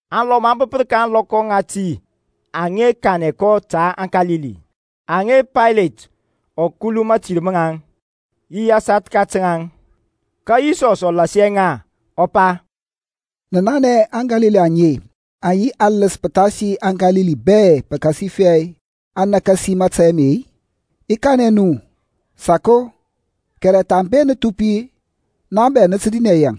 Alɔm aŋ bəpər ka ȧŋlɔkɔ ŋati aŋa kanɛ kɔ ta aŋKalili aŋa Paylet ɔ kuluŋ mȧtir maŋ yi asathka ta ŋaŋ. Ka Yisɔsȧŋ ɔ lasia ŋa ɔ pa, Nə nanɛ aŋKalili aŋe aŋ yi aləs pəthasi aŋKalili bɛ-i pəkasifɛ aŋ nakasi mȧtȧy ame-i? I kanɛ nu, sako, kɛrɛ thambe nə thupi-e, naŋ bɛ nə tə dinɛ yaŋ.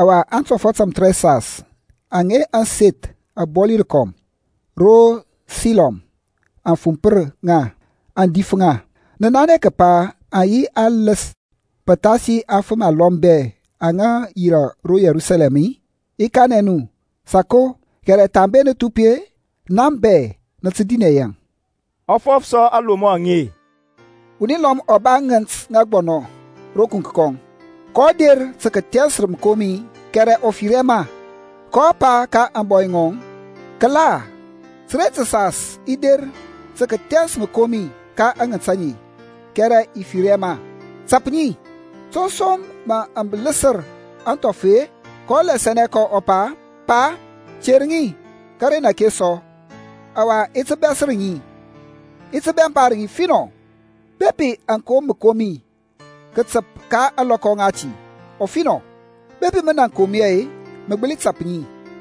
Ɔwa aŋtɔfɔt tamthərɛsas, aŋa ȧŋseth abɔli rəkɔm ro Silɔm aŋ fumpər ŋa, aŋ dif ŋa, nə nanɛ kəpa aŋ yi aləs pəthasi aŋfəm alɔm bɛ aŋa yirȧ ro Yerusalɛm-i? I kanɛ nu, sako, kɛrɛ thambe nə thupi-e, naŋ bɛ nə tə dinɛ yaŋ. Ɔ fɔf sɔ aŋlomɔ aŋe, Wuni lɔm ɔ ba ŋənt ŋa aŋgbɔnɔ ro kuŋk kɔŋ, kɔ der tə kəthɛns məkomi kɛrɛ ɔ fir hɛ ma. kɔ pa ka ȧŋbɔy ŋɔŋ, Kəla, təren təsas i der tə kəthɛns məkomi ka aŋənt aŋe kɛrɛ i fir hɛ ma. Tap ŋi. To pə som aŋ ləsər sɔ aŋthɔf-e? kɔ lasianɛ kɔ ɔ pa, Pa, ter ŋi kəren ake sɔ, ɔwa i ti bɛsər ŋi, i ti bɛmpar ŋi finɔ. Bepi aŋ kom məkomi kətəp ka ȧŋlɔkɔ ŋati, ɔfinɔ. Bepi mən aŋ kom hɛ-e, mə gbəli tap ŋi.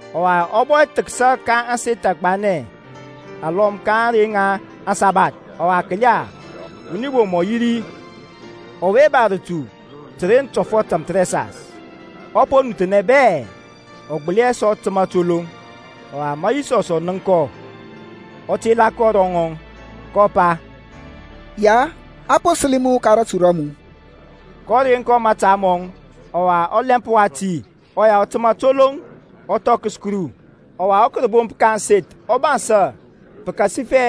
Ɔwa ɔ bɔ thəksa ka aseth agbanɛ alɔm ka ȧŋrey ŋa aŋsabath. Ɔwa kəla, wuni bom ɔ yi ri ɔwe ba rətu təren tɔfɔt tamthərɛsas. Ɔ po nuthnɛ bɛ, ɔ gbəli hɛ sɔ təmȧ toloŋ. Ɔwa ma Yisɔs ɔ nənk kɔ, ɔ tela kɔ ro rɔŋɔŋ, kɔ pa, Ya, a po səli mu ka ratu ra mu. kɔ reŋ kɔ mȧta mɔŋ, ɔwa ɔlɛmp wati ɔya ɔ təmȧ toloŋ, ɔ thɔkəs Kuru. Ɔwa rȧbomp ka ȧŋseth agbanɛ ɔ bansȧ pəkasifɛ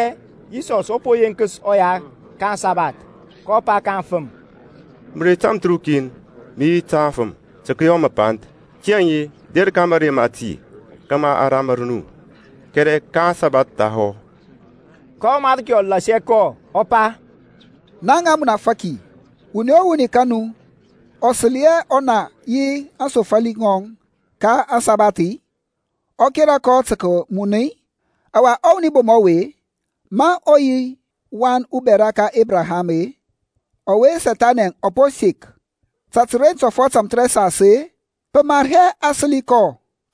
Yisɔsȧŋ ɔ po yenkəs ɔya ka aŋsabath, kɔ pa ka aŋfəm, Mərey tamthərukin mə yi ta afəm tə kəyɔ məpanth; tiyȧŋ der ka mȧrey mati kȧmȧ a ramər nu, kɛrɛ ka aŋsabath thahɔ. Ka ɔMarki ɔ lasia kɔ ɔ pa, Naŋ amunafaki, wuni o wuni ka nu ɔ səli hɛ ɔna yi aŋsofali ŋɔŋ ka ȧŋsabath-i, ɔ kera kɔ tə kəmun-i? Ɔwa ɔwuni bom ɔwe, ma ɔ yi wan ubɛra ka Ebraham-e, ɔwe Sethani ɔ po sek ta təren tɔfɔt tamthərɛsas-e, pə mar hɛ tə kəsəli kɔ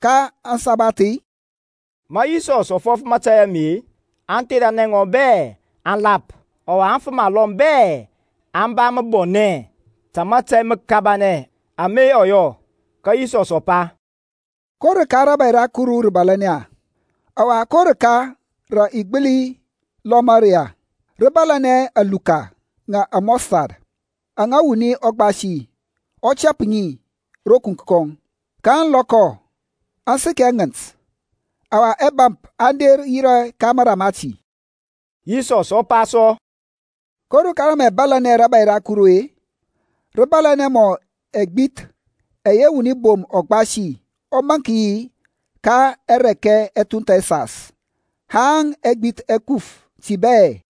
ka ȧŋsabath-i? Ma Yisɔs ɔ fɔf mȧtȧy ame-e, aŋtheranɛ ŋɔŋ bɛ aŋ lap. Ɔwa aŋfəm alɔm bɛ aŋ ba məbɔnɛ ta mȧtȧy məkabanɛ ama ɔ yɔ. Ka Yisɔs ɔ pa, Ko rəka rȧbȧy ra Kuru rə bȧlȧnɛ-e? Ɔwa ko rəka rə i gbəli lomɔ ri-e? Rə bȧlȧnɛ aluka ŋa amustard aŋa wuni ɔ gbasi ɔ tɛp ŋi ro kuŋk kɔŋ, kaŋ lɔkɔ, aŋ səkɛ ŋənt. Ɔwa ɛbȧmp aŋ der yirȧ ka mara mati. Yisɔs ɔ pa sɔ, Ko rəka rə mə i lomɔ rȧbȧy ra Kuru-e? Rə bȧlȧnɛ mɔ ɛgbith ɛyɛ wuni bom ɔ gbasi ɔ maŋk yi ka arɛkɛ ɛthunth ɛsas, haŋ ɛgbith ɛ kuf ti bɛ.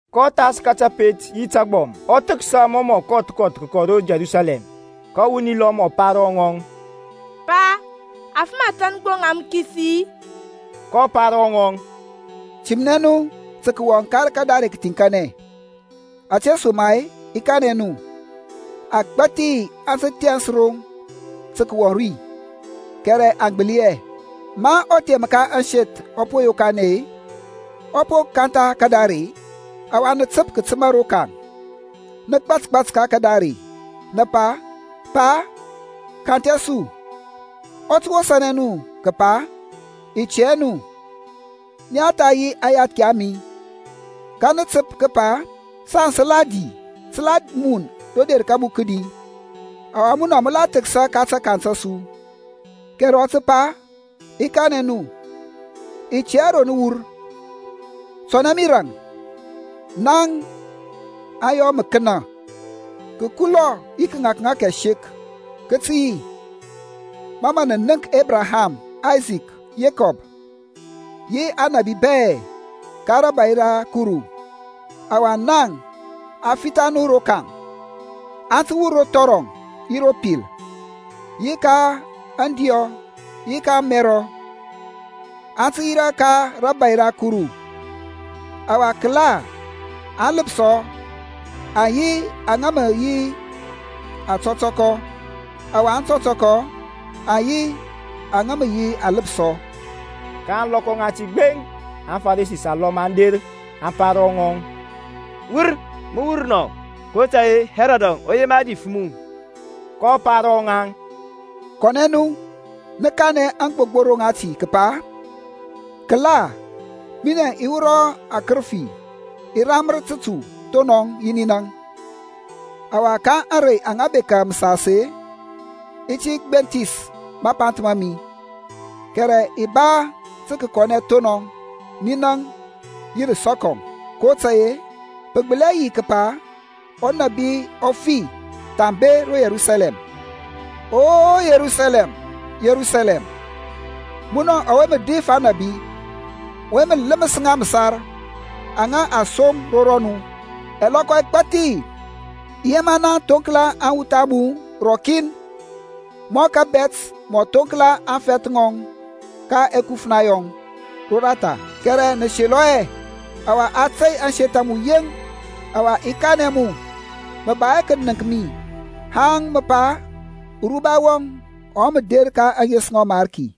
kɔ thas ka təpet yi təgbɔm, ɔ thəksa mɔ mə ɔ kɔth kɔth kəkɔ ro Yerusalɛm. Ka wuni lɔm ɔ pa ro ŋɔŋ, Pa, afəm athȧn gbo ŋa mə kisi-i? kɔ pa ro ŋaŋ, Timnɛ nu tə kəwɔŋ ka kadare kəthiŋkanɛ, ȧtesoma-e i kanɛ nu, agbȧthi aŋ tə thɛns aroŋ tə kəwɔŋ ri, kɛrɛ aŋ gbəli hɛ. Ma ɔthem ka ȧŋseth ɔ po yokanɛ-e, ɔ po kantha kadare-e, ɔwa nə təp kətəma rokaŋ, nə gbȧtgbȧt ka kadare, nə pa, Pa, kanthɛ su; ɔ tə wosȧnɛ nu kəpa, I tɛ hɛ nu. Nia tha yi aŋyathki a mi. Ka mə nə təp kəpa, Saŋ sə la di, sə la mun ro der ka mu kədi, ɔwa munɔ mə la thəksa ka takaŋ ta su. Kɛrɛ ɔ tə pa, I kanɛ nu, i tɛ hɛ ro nə wur; tɔnɛ mi raŋ, naŋ aŋyɔ məkənȧ. Kəkulɔ yi kəŋȧkŋȧk ɛsek kə tə yi ma mə nə nənk Ebraham, Aysak, Yekɔb, yi aŋnabi bɛ ka rȧbȧy ra Kuru, ɔwa naŋ a fitha nu rokaŋ. Aŋ tə wur ro thɔrɔŋ yi ro pil, yi ka aŋdiɔ yi ka ȧŋmɛrɔ, aŋ tə yirȧ ka rȧbȧy ra Kuru. Ɔwa, kəla, aŋləpsɔ aŋ yi aŋa mə re yi aŋtɔtɔkɔ, ɔwa aŋtɔtɔkɔ aŋ yi aŋa mə re yi aŋləpsɔ. Ka ȧŋlɔkɔ ŋati gbeŋ aFaresi alɔm aŋ der aŋ pa ro ŋɔŋ, Wur, mə wur nɔ; kotȧy-e Hɛrɔdȧŋ ɔ yema dif mu. kɔ pa ro ŋaŋ, Kɔnɛ nu, nə kanɛ aŋgbogboro ŋati kəpa, kəla, minɛŋ i wurɔ akərəfi, i ramər tətu thonɔŋ yi ninaŋ, ɔwa ka ȧŋrey aŋa bekȧ məsas-e, i ti gbenthis mapanth ma mi. Kɛrɛ i ba tə kəkɔnɛ thonɔŋ, ninaŋ yi rəsɔkɔŋ; kotȧy-e pə gbəli hɛ yi kəpa unabi ɔ fi thambe ro Yerusalɛm. O Yerusalɛm, Yerusalɛm, munɔ ɔwe mə dif aŋnabi, ɔwe mə ləmər ŋa məsar aŋa a som ro rɔmu; ɛlɔkɔ ɛgbathi i yema naŋ thoŋkla aŋwuth a mu rɔkin, mɔ kȧbɛt mɔ thoŋkla aŋfɛth ŋɔŋ ka ɛkufna yɔŋ roratha, kɛrɛ nə selɔ hɛ. Ɔwa a tey ȧŋseth a mu yeŋ; ɔwa i kanɛ mu, mə ba hɛ kənəŋk mi haŋ mə pa, Uruba wɔŋ ɔwe mə der ka ȧŋes ŋa ɔMarki.